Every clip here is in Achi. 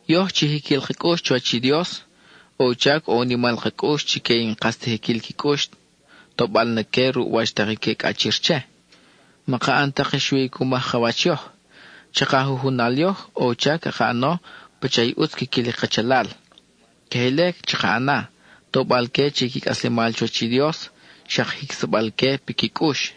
Yoj chi jiquil ka cʼux chuwach i Dios, ʼo u chac ʼo u nimal ka cʼux chique i n-kas ta jiquil qui cʼux, tobal na que ruʼ wach tak i que cʼachir che. Maka ʼan tak i xui cu maj ka wach yoj. Chaka jujunal yoj, ʼo u chac caka ʼano pacha i ʼutz quiquil i kachalal. Queje ile chaka ʼana, tobal-que che i qui cʼaslemal chuwach i Dios, xak jicsa-bal-que piqui cʼux.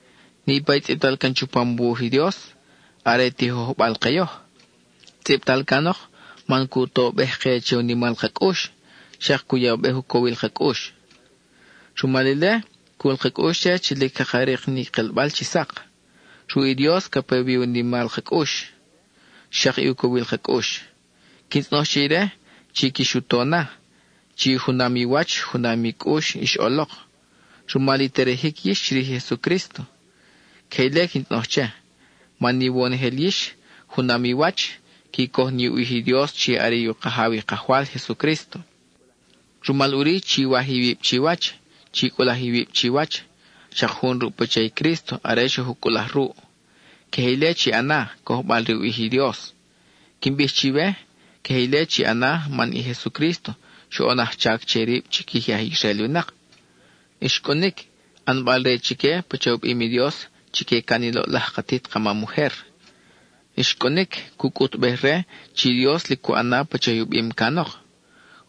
Niʼpa i tzʼibtal can chupam u wuj i Dios, are tijojbal ke yoj. Tzʼibtal canok, man cu tobej-ke che u nimal ka cʼux, xak cu yabej u cowil ka cʼux. Rumal ile, cul ka cʼux che chi lic caka rik ni kelbal chi sak. Ruʼ i Dios ca pe wi i u nimal ka cʼux, xak i u cowil ka cʼux. Quin tzʼonoj che ire, chi quix u to na, chi junam i wach junam i cʼux ix ʼolok, rumal i terejic yix chirij i Jesucrísto. Queje ile quin tzʼonoj che, man iwonojel yix, junam i wach, qui coj ni u ʼij i Dios chi are i u Kajaw i Kajwal Jesucrísto. Rumal ʼuri chiwaj iwib chiwach; chi cʼulaj iwib chiwach, xak jun ruʼ pacha i Crísto are xoj u cʼulaj ruʼ. Queje ile chi ʼana, cojbal re u ʼij i Dios. Quin bij chiwe, queje ile chi ʼana man i Jesucrísto xoʼon ajchac che rib chiquij i aj Israel winak. Xcʼunic, ʼanbal-re chique pacha u bim i Dios chique can i loʼlaj katit ka mam ujer; xcʼunic cu cʼutbej re chi Dios lic cu ʼan na pacha i u bim canok.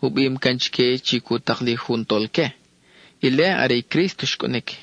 (U bim can chique chi cu tak li jun tolque, ile are i Crísto xcʼunic.)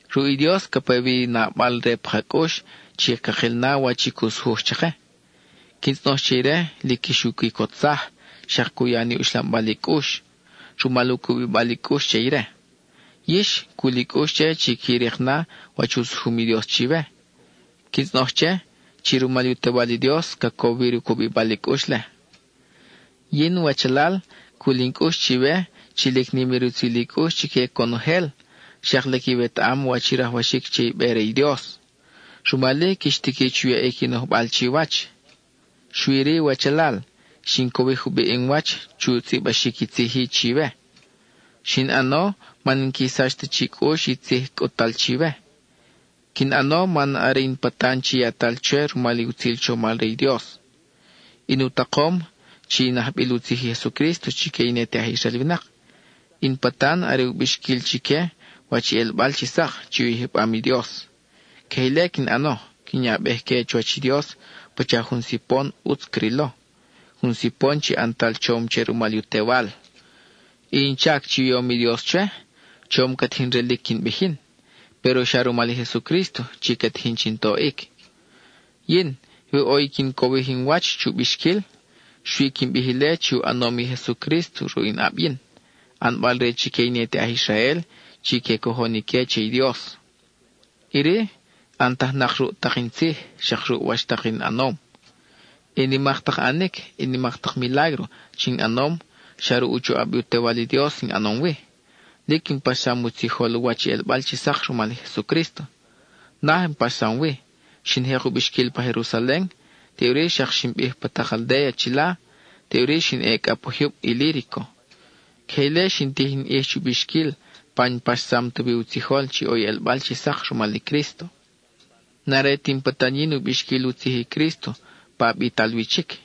Ruʼ i Dios ca pe wi i nabal-re pa ka cʼux chi cakil na wach i cu sujuj chake. Quin tzʼonoj che ire lic quix u quicotsaj, xak cu ya ni uxlambal i cʼux, rumal u cubibal i cʼux che ire. Yix, cul i cʼux che chi qui rik na wach u sujum i Dios chiwe. Quin tzʼonoj che, chi rumal i u Tewal i Dios, ca cowir u cubibal i cʼux-le. Yin, wachalal, cul in cʼux chiwe chi lic nim i rutzil i cʼux chique conojel, xak lic iwetaʼam wach i rajwaxic che i be re i Dios; rumal-i quix tiqui chu yaʼic i nojbal chiwach. Xui-ri, wachalal, xin cowij jubiʼ in wach chu tzʼibaxic i tzij-i chiwe; xin ʼano man n-qui sach ta chi cʼux i tzij cʼut-tal chiwe. Quin ʼano man are in patan chi yatal chwe rumal i utzil chomal re i Dios. In u takom, chi in ajbil u tzij i Jesucrísto chique i ne te aj Israel winak; in patan are u bixquil chique wach i ʼelbal chi sak chi u yijbam i Dios. Queje ile quin ʼano quin yabej-que chuwach i Dios pacha jun sipon ʼutz crilo, jun sipon chi ʼantal chom che rumal u Tewal. I in chac chi u yom i Dios chwe, chom ca tijin relic quin bij yin, péro xa rumal i Jesucrísto chi ca tijin chin toʼic. Yin, we ʼo i quin cowij in wach chu bixquil, xui quin bij ile chi u ʼanom i Jesucrísto ruʼ in ʼab yin, ʼanbal-re chique i ne te aj Israel chi que cojon ique che i Dios. Iri, ʼantajnak ruʼ tak in tzij, xak ruʼ wach tak in ʼanom. I nimak tak ʼanic, nimak tak milágro chi in ʼanom, xa ruʼ u choʼab i u Tewal i Dios in ʼanom wi. Lic in paxsam u tzijol wach i ʼelbal chi sak rumal i Jesucrísto. Naj in paxsam wi; xin jek u bixquil pa Jerusalen, teʼuri xak xin bij pa tak aldéa chila, teʼuri xin ʼe cʼa pa jyub Ilírico. Queje ile xin tij in ʼij chu bixquil pa n-paxsam ta wi u tzijol chi ʼo i ʼelbal chi sak rumal i Crísto. N-are ti in patan yin u bixquil u tzij i Crísto pa bital wi chic.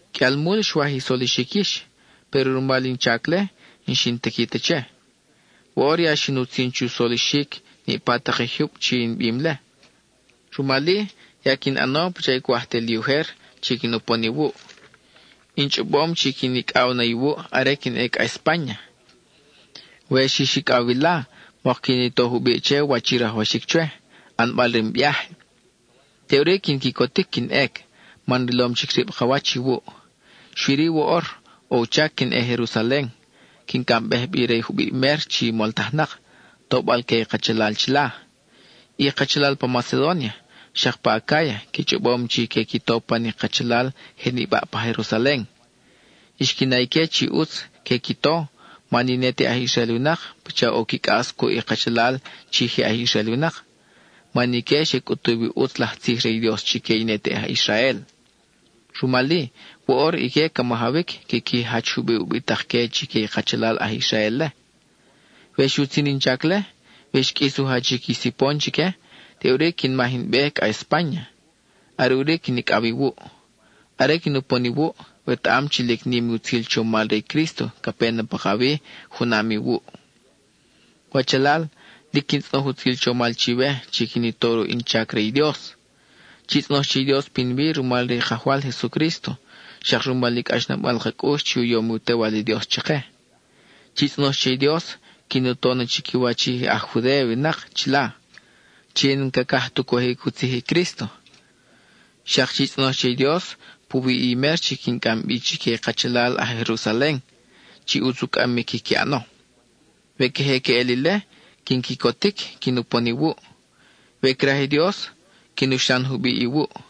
Qʼuial mul xwaj i solixic yix, péro rumal in chac-le, n-xin tiqui ta che. Woʼor ya xin utzin chu solixic niʼpa tak i jyub chi in bim-le. Rumal-i, ya quin ʼano pacha cwaj te li ujer chi quin upon iwuʼ. In chʼobom chi quin icʼaw na iwuʼ are quin ʼe cʼa Espáña; we xix icʼaw wila, mok quin i to jubiʼ che wach i rajwaxic chwe, ʼanbal re in viáje. Teʼuri quin quicotic quin ʼec, man rilom chic rib ka wach iwuʼ. Xui-ri woʼor, ʼo u chac quin ʼe Jerusalen, quin cʼambej bi re jubiʼ mer chi moltajnak, tobal-que i kachalal chila. I kachalal pa Macedónia, xak pa Acáya qui chʼobom chi que qui to pan i kachalal je nibaʼ pa Jerusalen. Xqui na ique chi ʼutz que qui to, man i ne te aj Israel winak pacha ʼo qui cʼas cuʼ i kachalal chi je aj Israel winak, man ique xe cʼutuw i ʼutz laj tzij re i Dios chique i ne te aj Israel. Rumal-i, woʼor ique ca majawic quiqui jach jubiʼ ubitak-que chique i kachalal aj Israel-le. We xutzin in chac-le, we xqʼuis u jachic i sipon chique, teʼuri quin maj in be cʼa Espáña. Are ʼuri quin icʼaw iwuʼ. Are quin upon iwuʼ, wetaʼam chi lic nim i utzil chomal re i Crísto ca pe na pakawi junam iwuʼ. Wachalal, lic quin tzʼonoj utzil chomal chiwe chi quin i to ruʼ in chac re i Dios; chi tzʼonoj che i Dios pinwi rumal re i Kajwal Jesucrísto, xak rumal i cʼaxnabal ka cʼux chi u yom i u Tewal i Dios chake. Chi tzʼonoj che i Dios, quin u to na chiquiwach i aj Judéa winak chila, chi n-cacaj tu cojic u tzij i Crísto. Xak chi tzʼonoj che i Dios puwi i mer chi quin cʼam bi chique i kachalal aj Jerusalen, chi ʼutz u cʼamic quiqui ʼano. We queje queʼel ile, quin quicotic quin upon iwuʼ. We craj i Dios, quin uxlan jubiʼ iwuʼ.